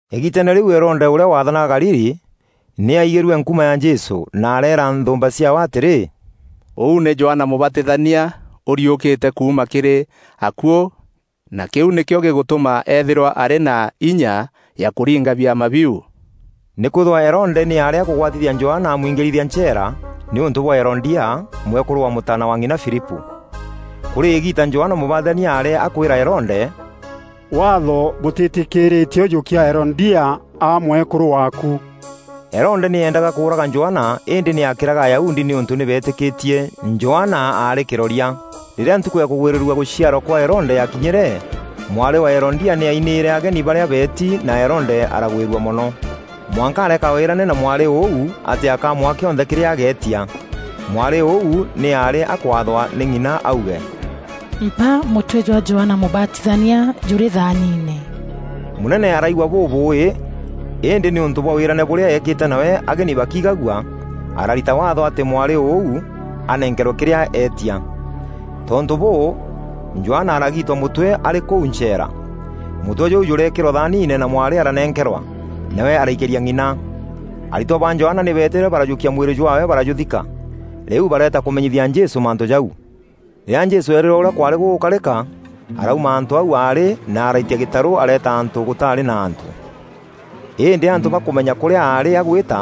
Îgiiteene rîu Herode ûrîa waathanaga Galili, nî aigîrue nkuma ya Jesû na areera nthûûmba ciaawe atîrî, “Ûu nî Johana Mûbatithania ûriûkîte kuuma kîrî akuû na kîu nîkîo gîgûtûma eethîrwa arî na inya ya kûringa biama biu.” Nîkwîthîrwa Herode nî aarî akûgwatithia Johana amwiingîrithia ncheera, nîûntû bwa Herodia, mwekûrû wa mûtaana wa ng'ina Filipû. Kûrî îgiita Johana Mûbatithania aarî akûîra Herode, “Waatho bûtîtîkîîrîtie ûjûkia Herodia aa mwekûrû waaku.” Herode nî eendaga kûûraga Johana îndî nî aakîraga Ayahudi nîûntû nî beetîkîtie Johana aarî kîroria. Rîrîa ntukû ya kûgwîrîrua gûciarwa kwa Herode yakinyîre, mwarî wa Herodia nî ainîîre ageni barîa beeti na Herode aragwîrua mono, mwanka areeka wîrane na mwarî ûu atî akamwaa kîonthe kîrîa ageetia. Mwarî ûu nî aarî akwathwa nî ng'ina auge, “Mpa mûtwe jwa Johana Mûbatithania jûrî thaaniine.” Mûnene araigua bûbûûî, îndî nîûntû bwa wîrane bûrîa eekîte nawe ageni bakiigagua, ararita waatho atî mwarî ûu anenkerwe kîrîa eetia. Tontû bûû, Johana aragiitwa mûtwe arî kûu ncheera. Mûtwe jûu jûreekîrwa thaaniine na mwarî aranenkerwa, nawe araikîria ng'ina. Aritwa ba Johana nî beetîre barajûkia mwîrî jwaawe barajûthika. Rîu bareeta kûmenyithia Jesû mantû jau. Rîrîa Jesû eerîrwe ûrîa kwaarî gûgûkarîka, arauma antû au aarî na araitia gîtarû areeta antû gûtaarî na antû. Îndî antû bakûmenya kûrîa aarî agwîta,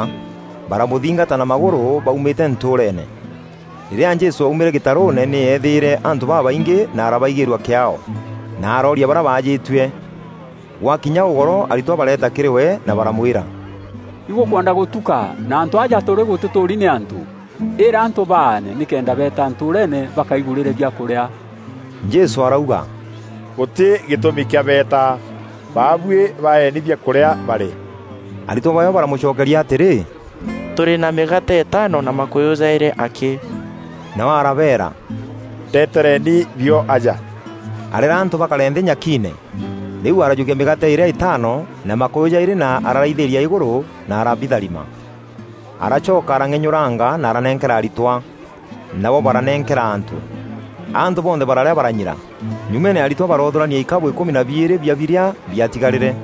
baramûthingata na magûrû baumîte ntûûreene. Rîrîa Jesû aumîre gîtarûûne nî eethîîre antû babaingî na arabaigîîrua kîaao, na arooria barîa baajîtue. Gwakinya ûgoro aritwa bareeta kîrî we na baramwîra, “Igûkwenda gûtuka na antû aja tûrî gûtîtûûri nî antû. Îra antû baane nîkenda beeta ntûûreene bakaigûrîre biakûrîa.” Jesû arauga, “Gûtî gîtûmi kîa beeta, baabuî baeeni biakûrîa barîe.” Aritwa baawe baramûcokeria atîrî, “Tûrî na mîgaate îtaano na makûyû jaîrî akî.” Nawe arabeera, “Ndetereni bio aja.” Areera antû bakare nthî nyakiine. Rîu arajûkia mîgaate îrîa îtaano na makûyû jaîrî na araraithîîria îgûrû, na arabîtharima. Aracoka arang'enyûranga na aranenkera aritwa, nabo baranenkera antû. Antû bonthe bararîa baranyira. Nyûmene aritwa baroothûrania ikabû îkûmi na biîrî bia birîa biatigarîre.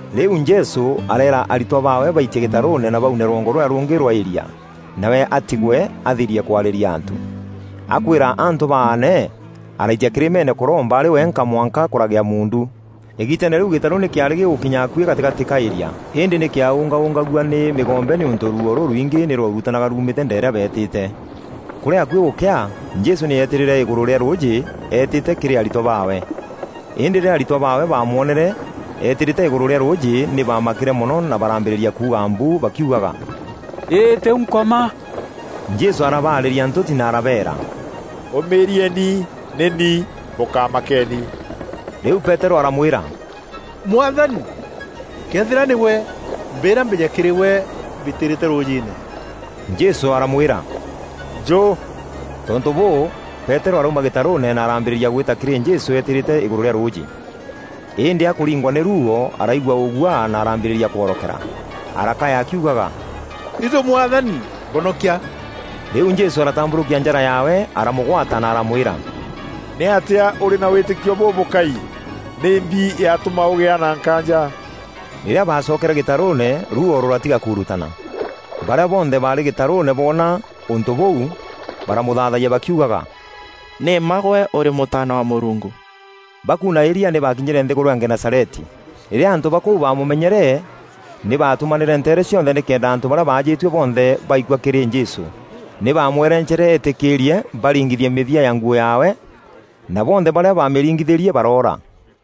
Rîu Jesû areera aritwa baawe baitie gîtarûûne na baune rwongo rûrîa rûngî rwa îria, nawe atigwe athirie kwarîria antû. Akwîra antû baane, araitia kîrîmeene kûromba arî wenka mwanka kûragîa muundu. Îgiiteene rîu gîtarû nî kîaarî gîgûkinya akuî gatîgatî ka îria, îndî nî kîaûngaûngagua nî mîgombe nîûntû ruuo rûrwingî nî rwaurutanaga ruumîte ndeerîa beetîte. Kûrî akuî gûkea, Jesû nî eetîrîre îgûrû rîa rûûjî eetîte kîrî aritwa baawe. Îndî rîrîa aritwa baawe baamwonere eetîrîte îgûrû rîa rûûjî nî baamakîre mono na baraambîrîria kuuga mbu, bakiugaga “Îî tîu Nkoma!” Jesû arabaarîria ntûti na arabeera, “Ûmîîrieni! Nî ni, bûkamakeeni.” Rîu Peterû aramwîra, “Mwathani, këethîra nîgwe, mbîîra mbîje kîrî gwe mbîtîîrîte rûûjîîne.” Jesû aramwîra, “Njû!” Tontû bûû, Peterû arauma gîtarûûne na arambîrîria gwîta kîrî Jesû eetîrîte îgûrû rîa rûûjî. Îndî akûringwa nî rûûo araigua ûguaa na arambîrîria kworokera. Arakaya akiugaga, “Itû Mwathani, mbonokia!” Rîu Jesû aratambûrûkia njara yaawe aramûgwata na aramwîra, “Nîatîa ûrî na wîtîkio bûbûkai! Nîmbi yatûma ûgîa na nkaanja?” Rîrîa baacokere gîtarûûne ruuo rûratiga kuurutana. Barîa bonthe baarî gîtarûûne boona ûntû bûu baramûthaathayia bakiugaga, “Nî mma gwe ûrî Mûtaana wa Mûrungu.” Bakuuna îria nî baakinyîre nthîgûrû ya Genesareti. Rîrîa antû ba kûu baamûmenyere nî baatûmanîre nteere cionthe nîkenda antû barîa baajîtue bonthe baikua kîrî Jesû. Nî bamwereencere etîkîîrie baringithie mîthia ya nguû yaawe, na bonthe barîa bamîringithîrie baroora.